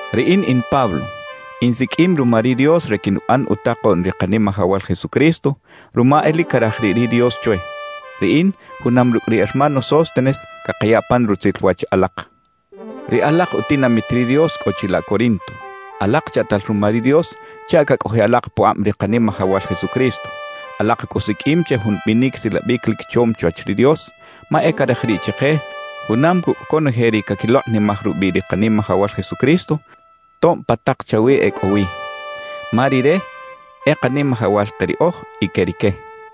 Riꞌin in Pablo, insiqꞌuim ruma ri Dios re quinuꞌan utakoꞌn ri Kanimajawal Jesucristo, ruma e lic caraj riꞌ ri Dios chwe. Riꞌin junam rucꞌ ri hermano Sóstenes cakaya pan rutzil wach alak, ri alak utinamit ri Dios cꞌo chilaꞌ Corinto. Alak chaꞌtal ruma ri Dios chaꞌ cacꞌojiꞌ alak pukꞌab ri Kanimajawal Jesucristo; alak cꞌu siqꞌuim che jun binic silabic lic chom chwach ri Dios, ma e caraj riꞌ chike junam cucꞌ conoje ri caquilokꞌnimaj rubiꞌ ri Kanimajawal Jesucristo, tob pa tak chawi e cꞌo wi. Ma Rire e Kanimajawal ke riꞌoj y que rique.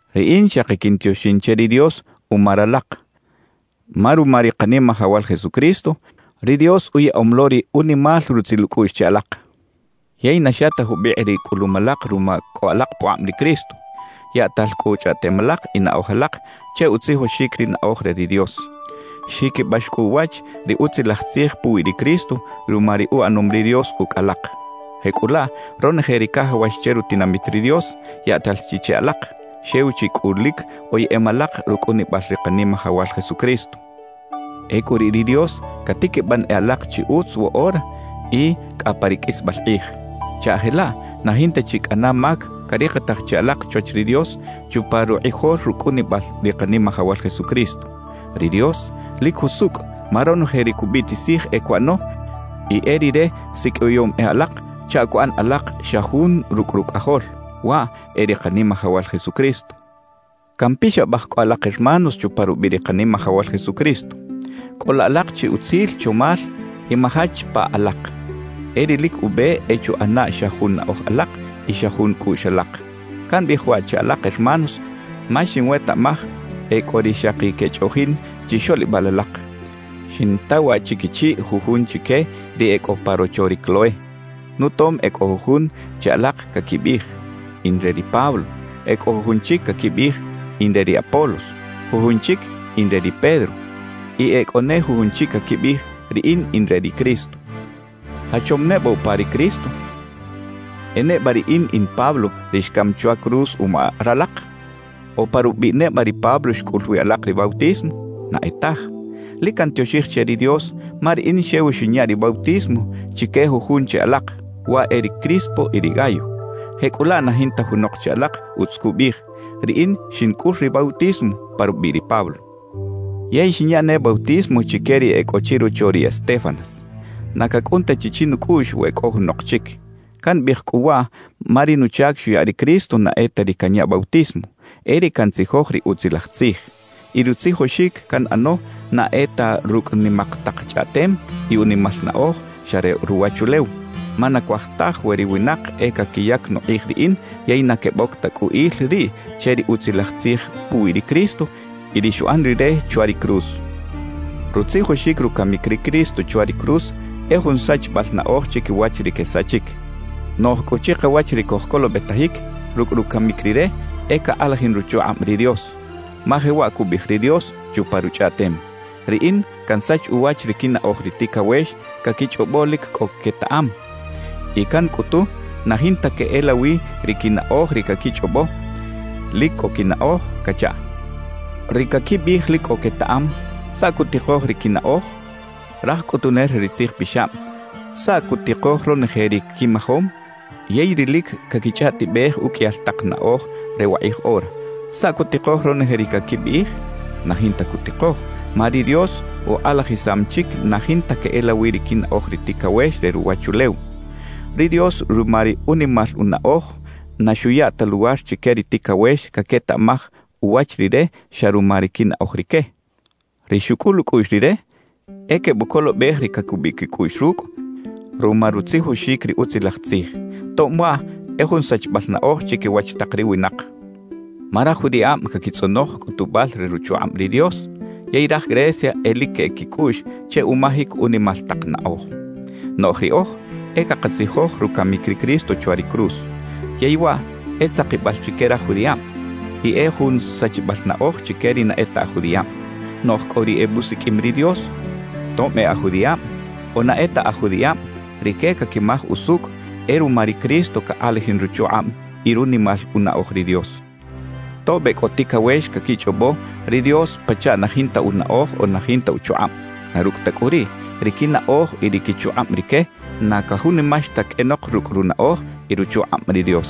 Riꞌin xaki quintioxin che ri Dios uma ralak, ma ruma ri Kanimajawal Jesucristo, ri Dios uyaꞌom lo ri unimal rutzil ucꞌuꞌx che alak. Yey na xa ta jubikꞌ ri cꞌulum alak ruma cꞌo alak pukꞌab ri Cristo; yaꞌtal cꞌu chꞌaꞌtem alak y naꞌoj alak che utzijoxic ri naꞌoj re ri Dios. Xjiquibax cꞌu uwach ri Utzilaj Tzij puwi ri Cristo ruma ri uꞌanom ri Dios ucꞌ alak. Jecꞌulaꞌ ronoje ri cajawax che rutinamit ri Dios, yaꞌtal chi che alak; xew chi cꞌu lic oyeꞌem alak rucꞌunibal ri Kanimajawal Jesucristo. Ecꞌu riꞌ ri Dios catiquiban e alak chi utz woꞌora y cꞌa pa ri qꞌuisbal kꞌij, chaꞌ jelaꞌ na jinta chi cꞌana mac carikitaj che alak chwach ri Dios chupa rukꞌijol rucꞌunibal ri Kanimajawal Jesucristo. Ri Dios lic jusucꞌ, ma ronoje ri cubiꞌtisij e cuꞌano y e Rire siqꞌuiyom e alak chaꞌ cuꞌan alak xa jun rucꞌ Rucꞌajol, waꞌ e ri Kanimajawal Jesucristo. Campixabaj cꞌu alak hermanos chupa rubiꞌ ri Kanimajawal Jesucristo: Cꞌola alak chi utzil chomal y majach pa alak. E ri lic ube e chuꞌana xa jun naꞌoj alak y xa jun cꞌuꞌx alak. Cambiꞌij waꞌ che alak hermanos ma xinwetaꞌmaj e cꞌo ri xaki quechꞌoꞌjin chixoꞌlibal alak; xinta waꞌ chiquichiꞌ jujun chique ri e cꞌo pa rocho ri Cloé. Nutom e cꞌo jujun che alak caquibiꞌij: «In re ri Pablo.» E cꞌo jujun chic caquibiꞌij: «In re ri Apolos,» jujun chic: «In re ri Pedro» y e cꞌo ne jujun chic caquibiꞌij: «Riꞌin in re ri Cristo.» ¿Jachom neba upa ri Cristo? ¿E neba riꞌin in Pablo ri xcam chwa cruz uma ralak? ¿O pa rubiꞌ neba ri Pablo xcꞌul wi alak ri bautismo? Na e taj. Lic cantioxij che ri Dios ma riꞌin xew xinya ri bautismo chique jujun che alak, waꞌ e ri Crispo y ri Gayo. Jecꞌulaꞌ na jinta junok che alak utz cubiꞌij: “Riꞌin xincꞌul ri bautismo pa rubiꞌ ri Pablo.” Yey xinya ne bautismo chique ri e cꞌo chirocho ri Estéfanas. Na cacꞌun ta chi chinucꞌuꞌx we cꞌo junok chic. Cambiꞌij cꞌu waꞌ ma ri nuchac xuya ri Cristo na e ta ri canya bautismo, e ri cantzijoj ri Utzilaj Tzij. Y rutzijoxic canꞌano na e ta rucꞌ nimak tak chꞌaꞌtem y unimal naꞌoj xa re ruwachulew. Ma na cuaj taj we ri winak e caquiyac nukꞌij riꞌin yey na queboc ta cꞌu il riꞌ che ri Utzilaj Tzij puwi ri Cristo y ri xuꞌan Rire chwa ri cruz. Rutzijoxic rucamic ri Cristo chwa ri cruz e jun sachibal naꞌoj chiquiwach ri quesachic. Noꞌj cꞌu chikawach ri cojcolobetajic, rucꞌ rucamic Rire e cakꞌalajin ruchukꞌab ri Dios. Ma jewaꞌ cubiꞌij ri Dios chupa Ruchꞌaꞌtem: Riꞌin cansach uwach ri quinaꞌoj ri ticawex caquichꞌobo lic cꞌo quetaꞌam, y cancꞌutu na jinta queꞌelawi ri quinaꞌoj ri caquichꞌobo lic cꞌo quinaꞌoj cachaꞌ. Ri caquibiꞌij lic cꞌo quetaꞌam, ¿saꞌ cutikoj ri quinaꞌoj? Raj cꞌutunel re ri tzijpixab, ¿saꞌ cutikoj ronoje ri quimajom? Yey ri lic caquichꞌaꞌtibej uqꞌuiyal tak naꞌoj re wakꞌij ora, ¿saꞌ cutikoj ronoje ri caquibiꞌij? Na jinta cutikoj, ma ri Dios ukꞌalajisam chic na jinta queꞌelawi ri quinaꞌoj ri ticawex re ruwachulew. Ri Dios ruma ri unimal unaꞌoj na xuya ta luwar chique ri ticawex caquetaꞌmaj uwach Rire xa ruma ri quinaꞌoj rique. Ri xucꞌul ucꞌuꞌx Rire e quebucolobej ri cacubiꞌ quicꞌuꞌx rucꞌ ruma rutzijoxic ri Utzilaj Tzij, tob waꞌ e jun sachibal naꞌoj chiquiwach tak ri winak. Ma raj judiꞌab caquitzꞌonoj cꞌutubal re ruchukꞌab ri Dios, yey raj Grecia e lic queꞌec quicꞌuꞌx che umajic unimal tak naꞌoj. Noꞌj riꞌoj e cakatzijoj rucamic ri Cristo chwa ri cruz. Yey waꞌ e tzakibal chique raj judiꞌab, y e jun sachibal naꞌoj chique ri na e ta aj judiꞌab. Noꞌj cꞌu ri ebusiqꞌuim ri Dios, tob e aj judiꞌab o na e ta aj judiꞌab, rique caquimaj usucꞌ e ruma ri Cristo cakꞌalajin ruchukꞌab y runimal unaꞌoj ri Dios. Tob e cꞌo ticawex caquichꞌobo ri Dios pachaꞌ na jinta unaꞌoj o na jinta uchukꞌab; na rucꞌ ta cꞌu riꞌ, ri quinaꞌoj y ri quichukꞌab rique, na cajunimax ta qꞌuenok rucꞌ runaꞌoj y ruchukꞌab ri Dios.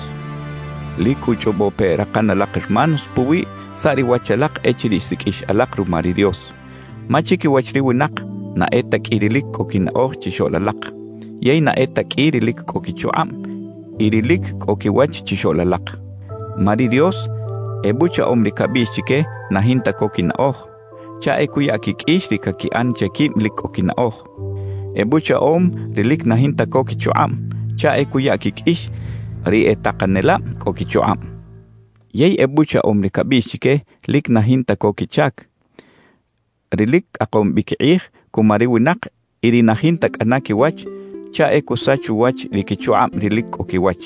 Lic cꞌu chꞌobo pe rakan alak hermanos puwi saꞌ ri wach alak echiriꞌ xsiqꞌuix alak ruma ri Dios; ma chiquiwach ri winak, na e ta qꞌui ri lic cꞌo quinaꞌoj chixoꞌl alak, yey na e ta qꞌui ri lic cꞌo quichukꞌab y ri lic cꞌo quiwach chixoꞌl alak. Ma ri Dios ebuchaꞌom ri cabiꞌx chique na jinta co quinaꞌoj, chaꞌ e cuya quiqꞌuix ri caquiꞌan che quib lic cꞌo quinaꞌoj. Ebuchaꞌom ri lic na jinta co quichukꞌab chaꞌ e cuya quiqꞌuix ri e takanelab cꞌo quichukꞌab. Yey ebuchaꞌom ri cabiꞌx chique lic na jinta co quichac, ri lic cꞌakom bi quikꞌij cuma ri winak y ri na jinta cꞌana quiwach chaꞌ e cusach uwach ri quichukꞌab ri lic cꞌo quiwach.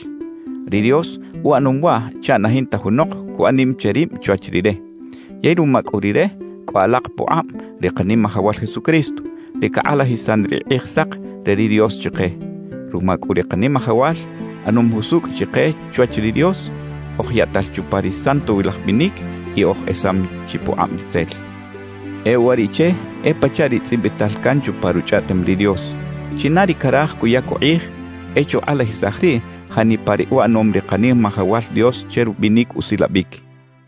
Ri Dios uꞌanom waꞌ chaꞌ na jinta junok cuꞌan nim che rib chwach Rire. Yey ruma cꞌu Rire cꞌo alak pukꞌab ri Kanimajawal Jesucristo, ri cakꞌalajisan ri Kꞌijsak re ri Dios chike. Ruma cꞌu ri Kanimajawal, ꞌanom jusucꞌ chike chwach ri Dios, oj yaꞌtal chupa ri santowilaj binic, y oj esam chi pukꞌab ritzel. E uwariꞌche e pachaꞌ ri tzꞌibital can chupa Ruchꞌaꞌtem ri Dios: China ri caraj cuyac ukꞌij, e chukꞌalajisaj riꞌ janipa ri uꞌanom ri Kanimajawal Dios che rubinic usilabic.